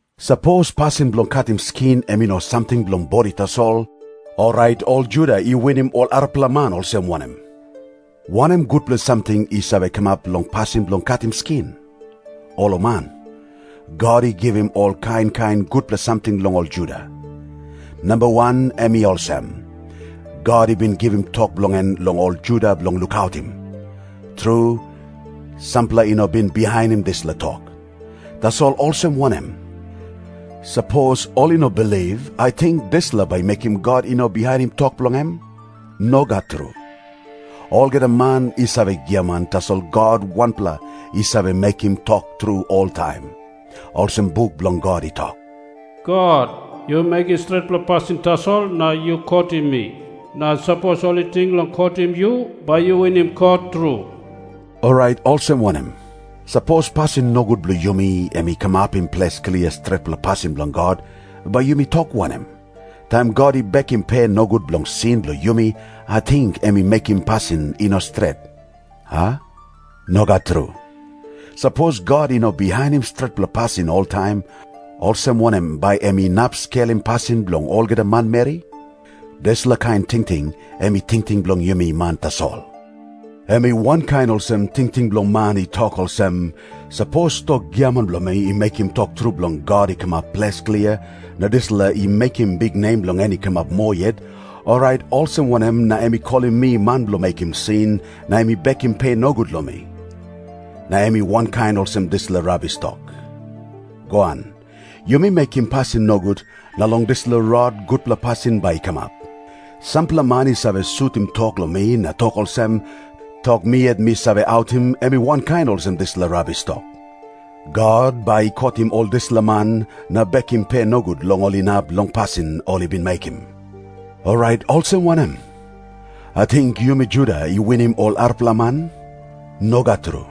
Sapos pasin bilong katim skin em i no samting bilong bodi tasol, orait ol Juda i winim ol arapela man olsem wanem? Wanem gutpela samting i save kamap long pasin bilong katim skin? Olaman! God i givim ol kain kain gutpela samting long ol Juda. Namba wan em i olsem. God i bin givim tok bilong en long ol Juda bilong lukautim. Tru, sampela i no bin bihainim dispela tok. Tasol olsem wanem? Sapos ol i no bilip, ating dispela bai i mekim God i no bihainim tok bilong em? Nogat tru. Olgeta man i save giaman, tasol God wanpela i save mekim tok tru oltaim. Olsem buk bilong God i tok, “God, yu mekim stretpela pasin tasol na yu kotim mi. Na sapos ol i ting long kotim yu, bai yu winim kot tru.” Orait olsem wanem? Sapos pasin nogut bilong yumi em i kamapim ples klia stretpela pasin bilong God, bai yumi tok wanem? Taim God i bekim pe nogut bilong sin bilong yumi, ating em i mekim pasin i no stret, a? Nogat tru. Sapos God i no bihainim stretpela pasin oltaim, olsem wanem bai em inap skelim pasin bilong olgeta manmeri? Dispela kain tingting em i tingting bilong yumi man tasol. Em i wankain olsem tingting bilong man i tok olsem, “Sapos tok giaman bilong mi i mekim tok tru bilong God i kamap ples klia, na dispela i mekim biknem bilong en i kamap moa yet, orait olsem wanem na em i kolim mi man bilong mekim sin, na em i bekim pe nogut long mi?” Na em i wankain olsem dispela rabis tok, “Goan, yumi mekim pasin nogut, na long dispela rot gutpela pasin bai i kamap.” Sampela man i save sutim tok long mi na tok olsem, tok mi yet mi save autim em i wankain olsem dispela rabis tok. God bai i kotim ol dispela man na bekim pe nogut long ol inap long pasin ol i bin mekim. Orait olsem wanem? Ating yumi Juda i winim ol arapela man? Nogat tru.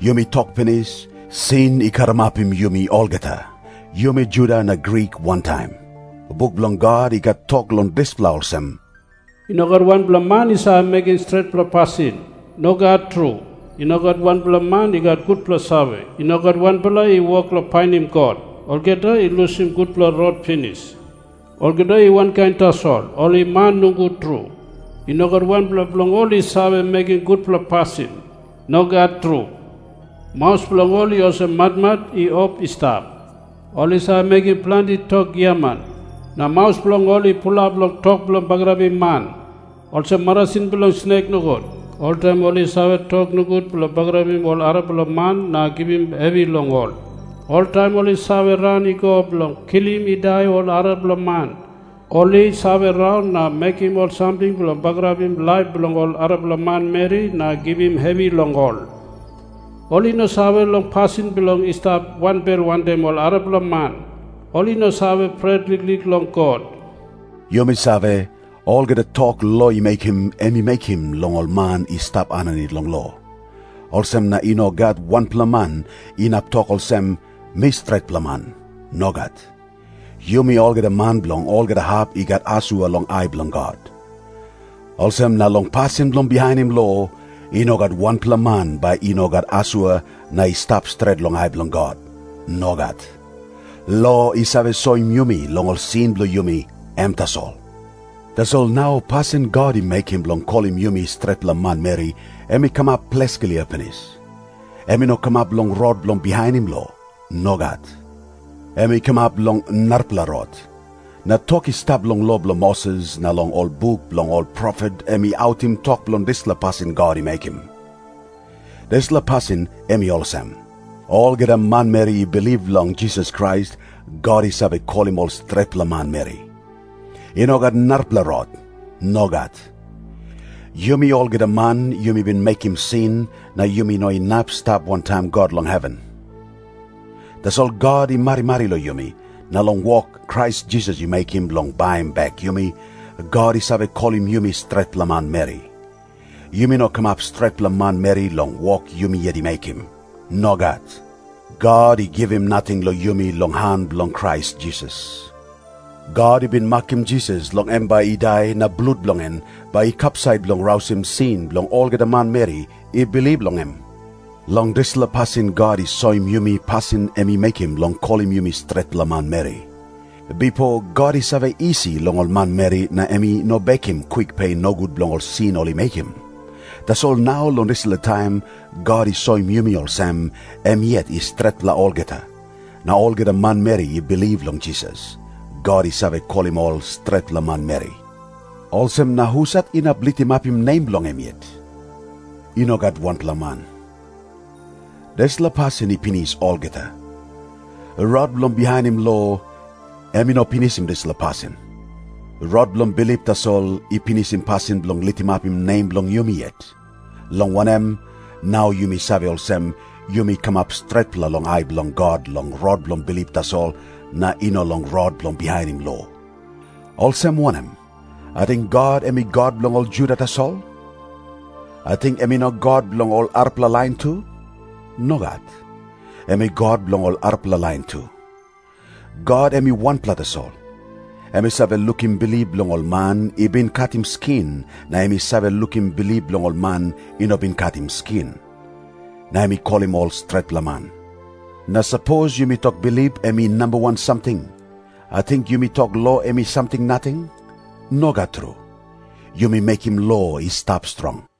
Yumi tok pinis, sin i karamapim yumi olgeta, yumi Juda na Grik wantaim. Buk bilong God i gat tok long dispela olsem, “I no gat wanpela man i save mekim stretpela pasin. Nogat tru. I no gat wanpela man i gat gutpela save. I no gat wanpela i wok long painim God. Olgeta i lusim gutpela rot pinis. Olgeta i wankain tasol, ol i man nogut tru. I no gat wanpela bilong ol i save mekim gutpela pasin. Nogat tru. Maus bilong ol i olsem matmat i op i stap. Ol i save mekim planti tok giaman. Na maus bilong ol i pulap long tok bilong bagarapim man, olsem marasin bilong snek nogut. Oltaim ol i save tok nogut bilong bagarapim ol arapela man na givim hevi long ol. Oltaim ol i save ran i go bilong kilim i dai ol arapela man. Ol i save raun na mekim ol samting bilong bagarapim laip bilong ol arapela manmeri na givim hevi long ol. Ol i no save long pasin bilong i stap wanbel wantaim ol arapela man. Ol i no save pret liklik long God.” Yumi save, olgeta tok lo i mekim, em i mekim long ol man i stap aninit long lo. Olsem na i no gat wanpela man inap tok olsem, “Mi stretpela man.” Nogat. Yumi olgeta man bilong olgeta hap i gat asua long ai bilong God. Olsem na long pasin bilong bihainim lo “i no gat wanpela man bai i no gat asua na i stap stret long ai bilong God.” Nogat. Lo i save soim yumi long ol sin bilong yumi, em tasol. Tasol nau pasin God i mekim bilong kolim yumi stretpela manmeri, em i kamap ples klia pinis. Em i no kamap long rot bilong bihainim lo. Nogat. Em i kamap long narapela rot. Na tok i stap long lo bilong Moses na long ol buk bilong ol profet em i autim tok bilong dispela pasin God i mekim. Dispela pasin em i olsem. Olgeta manmeri i bilip long Jisas Krais, God i save kolim ol stretpela manmeri. I no gat narapela rot. Nogat. Yumi olgeta man yumi bin mekim sin, na yumi no inap i stap wantaim God long heven. Tasol God i marimari long yumi, na long wok Krais Jisas i mekim bilong baim bek yumi, God i save kolim yumi stretpela manmeri. Yumi no kamap stretpela manmeri long wok yumi yet i mekim. Nogat. God i givim nating long yumi long han bilong Krais Jisas. God i bin makim Jisas long em bai i dai na blut bilong en bai i kapsait bilong rausim sin bilong olgeta manmeri i bilip long em. Long dispela pasin God i soim yumi pasin em i mekim bilong kolim yumi stretpela manmeri. Bipo God i save isi long ol manmeri na em i no bekim kwik pe nogut bilong sin ol i mekim. Tasol nau long dispela taim God i soim yumi olsem em yet i stretpela olgeta. Na olgeta manmeri i bilip long Jisas, God i save kolim ol stretpela manmeri. Olsem na husat inap litimapim nem bilong em yet? I no gat wanpela man. Dispela pasin i pinis olgeta. Rot bilong bihainim lo, em i no pinisim dispela pasin. Rot bilong bilip tasol i pinisim pasin bilong litimapim nem bilong yumi yet. Long wanem, nau yumi save olsem, yumi kamap stretpela long ai bilong God long rot bilong bilip tasol, na i no long rot bilong bihainim lo. Olsem wanem? Ating God em i God bilong ol Juda tasol? Ating em i no God bilong ol arapela lain tu? Nogat. Em i God bilong ol arapela lain tu. God em i wanpela tasol. Em i save lukim bilip bilong ol man i bin katim skin na em i save lukim bilip bilong ol man i no bin katim skin. Na em i kolim ol stretpela man. Na sapos yumi tok bilip em i namba wan samting, ating yumi tok lo em i samting nating? Nogat tru. Yumi mekim lo i stap strong.